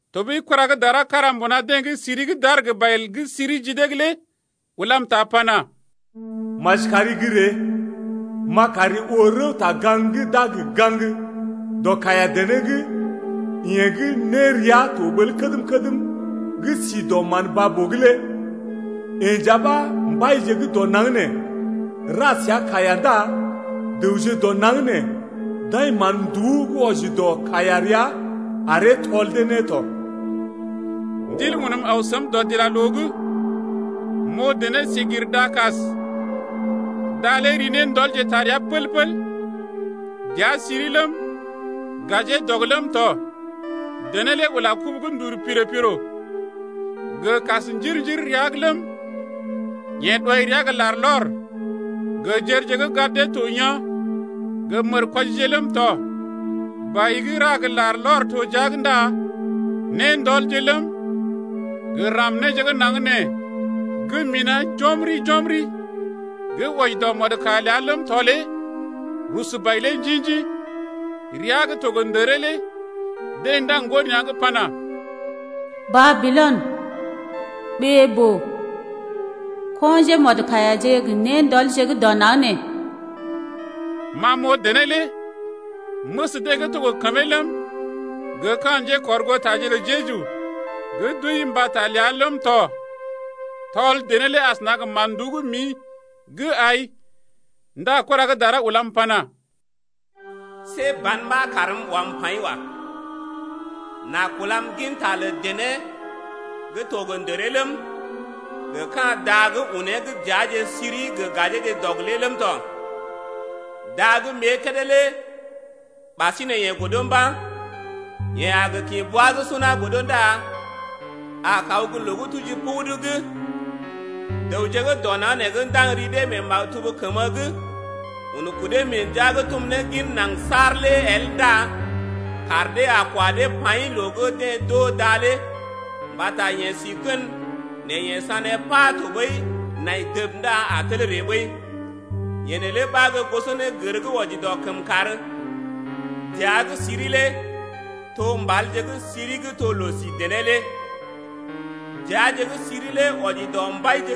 Tɔɓəi kura gə́ dara kára mbuna deḛ gə́ siri gə́ d’aar gə bai gə́ siri ji dee’g lé ulam ta pana: Maji kari gə́ ree, m’a kari oo rəwta-gaŋg gə́ d’a gə gaŋg dɔ kaiya-dené’g yeḛ gə́ nérea to ɓəl kədm-kədm gə́ si dɔ mán baa-boo’g lé. Yeḛ nja ɓa mbaije gə́ dɔ naŋg nee ra səa kaiya ndá dəwje dɔ naŋg nee d’ai mán-nduú gə́ wɔji dɔ kaiya rəa aree tɔl dee ne tɔ. Ndil unm aw səm dɔdilaloo’g. M’oo dené si gir da-kas’g, da lé ri néndɔlje taa rəa pəl-pəl. Dəa siri ləm, gajee dɔg ləm tɔ. Dené lé ula kubu gə́ ndul piro-piro gə kas njir-njir rəa’g ləm, yeḛ ɗɔi rəa gə larlɔr gə jərje gə́ gad dee to yaa̰ gə mərkwɔjije ləm tɔ. Bai gə́ ra gə larlɔr to jia’g ndá néndɔlje ləm, gə ram néje gə́ naŋg nee gə́ mina̰ jɔmri-jɔmri gə́ wɔji dɔ mɔdkaiya ləa ləm tɔ lé rusu bai lé njḭ-njḭ. Ria gə́ to gə ndəree lé deḛ ndaŋg ŋgo nea̰’g pana: Babilɔn, ɓee-boo, ko̰ njémɔdkaiyaje gə néndɔlje gə́ dɔ naŋg nee. Ma m’oo dené lé, məs deḛ gə́ to gə kəmee ləm, gə ka̰ njékɔrgootaje lə Jeju gə́ d’wəi mbata ləa ləm tɔ tɔl dené lé asəna gə mán-nduú gə́ mḭ gə́ ai. Ndá kura gə́ dara ulam pana: See ban ɓa kaarm wam paḭ wa. N’a kulam ginta lə dené gə́ to gə ndəree ləm, gə ka̰ da gə́ unee gə́ dəaje siri gə gajeeje dɔg lé ləm tɔ. Da gə́ m’ée kédé lé ɓasinè yeḛ godo mba̰. Yeḛ a gə kḭ bwa gə́ suna godo ndá a kaw gə́ loo gə́ tuji pugudu’g. Dəwje gə́ dɔ naŋg nee gə́ ndaŋg ri dee mee maktub kəmə’g un kudee mee ndəa gə́ tum ne gin naŋg saar lé el ndá kaar dee a kwa dee paḭ loo gə́ deḛ d’oo da lé mbata yeḛ si gən nɛ yeḛ sané pa tɔɓəi nai dəb ndá a tel ree ɓəi. Yee neelé ɓa gə́ gosonégər gə́ wɔji dɔ kəmkàr. Dəa gə́ siri lé to mbalje gə́ siri gə́ to loo-si dené lé. Dəaje gə́ siri lé wɔji dɔ mbaije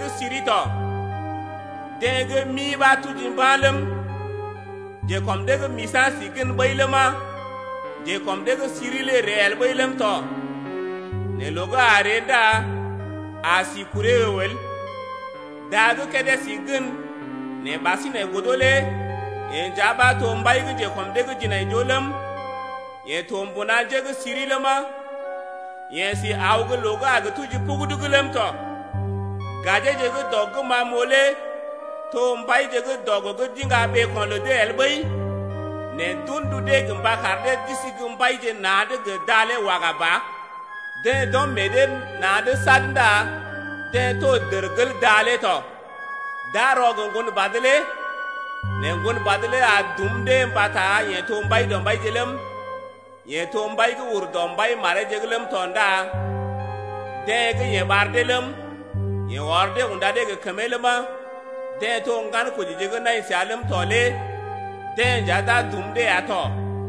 gə́ siri tɔ. Deḛ gə́ mi ɓa tuji mba̰ nɛ ləm, njekɔm dee gə́ misa̰ si gən ɓəi ləma, njekɔm dee gə́ siri lé ree el ɓəi ləm tɔ nɛ loo gə́ a ree ndá a si kuree əw el. Da gə́ kédé si gən nɛ ɓasinè godo lé yee nja ɓa to mbai gə́ njekɔm dee’g jinaijoo ləm, yee to mbuna njé gə́ siri ləma, yeḛ si aw loo gə́ a gə tuji pugudu’g ləm tɔ. Gajeje gə́ dɔg gə́ ma m’oo lé to mbaije gə́ dɔg gə́ d’iŋga ɓeeko̰ lə dee el ɓəi, nɛ d’un ndu dee gə mba kar dee d’isi gə́ mbaije na̰’d gə da lé waga ba. Deḛ d’ɔm meḛ dee na̰’d sad ndá deḛ to dərgel da lé tɔ. D’a rɔ gə Ŋgonbad lé nɛ Ŋgonbad lé a dum dee mbata yeḛ to Mbaidɔmbaije ləm, yeḛ to Mbai gə́ ur dɔ mbai mareeje’g ləm tɔ ndá deḛ gə́ yeḛ ɓar dee ləm, yeḛ ɔr dee unda dee gə kəmee ləma, deḛ to ŋgankojije gə́ nai səa ləm tɔ lé deḛ nja d’a dum dee ya tɔ.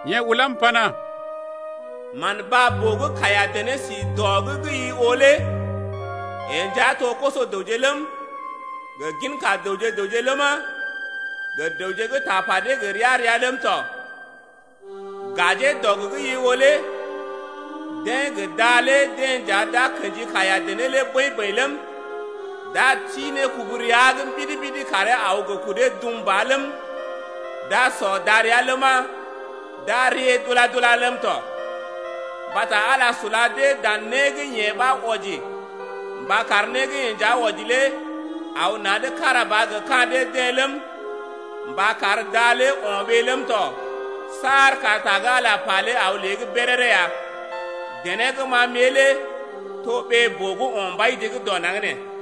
Yeḛ ulam pana: Man baa-boo gə́ kaiya-dené si dɔ’g gə́ i oo lé yee nja to koso-dəwje ləm, gə ginka dəwje-dəwje ləma, gə dəwje gə́ tapa dee gə ria-ria ləm tɔ. Gajee dɔg gə́ i oo lé deḛ gə da lé deḛ nja d’a kḛji kaiya-dené lé bəḭ-bəḭ ləm, d’a ti ne kubu rəa’g mbidi-mbidi karee aw gə kudee dum ba ləm, d’a sɔ darəa ləma, d’a rée dula-dula ləm tɔ. Mbata Ala sula dee dan né gə́ yeḛ ɓa wɔji mba kar né gə́ yeḛ nja wɔji lé aw na̰’d kára ba gə ka̰ dee-deḛ ləm, mba kar da lé o̰ ɓee ləm tɔ saar kar ta gə́ Ala pa lé aw lée’g béréré ya. Dené gə́ ma m’ée lé to ɓee-boo gə́ o̰ mbaije gə́ dɔ naŋg nee ya.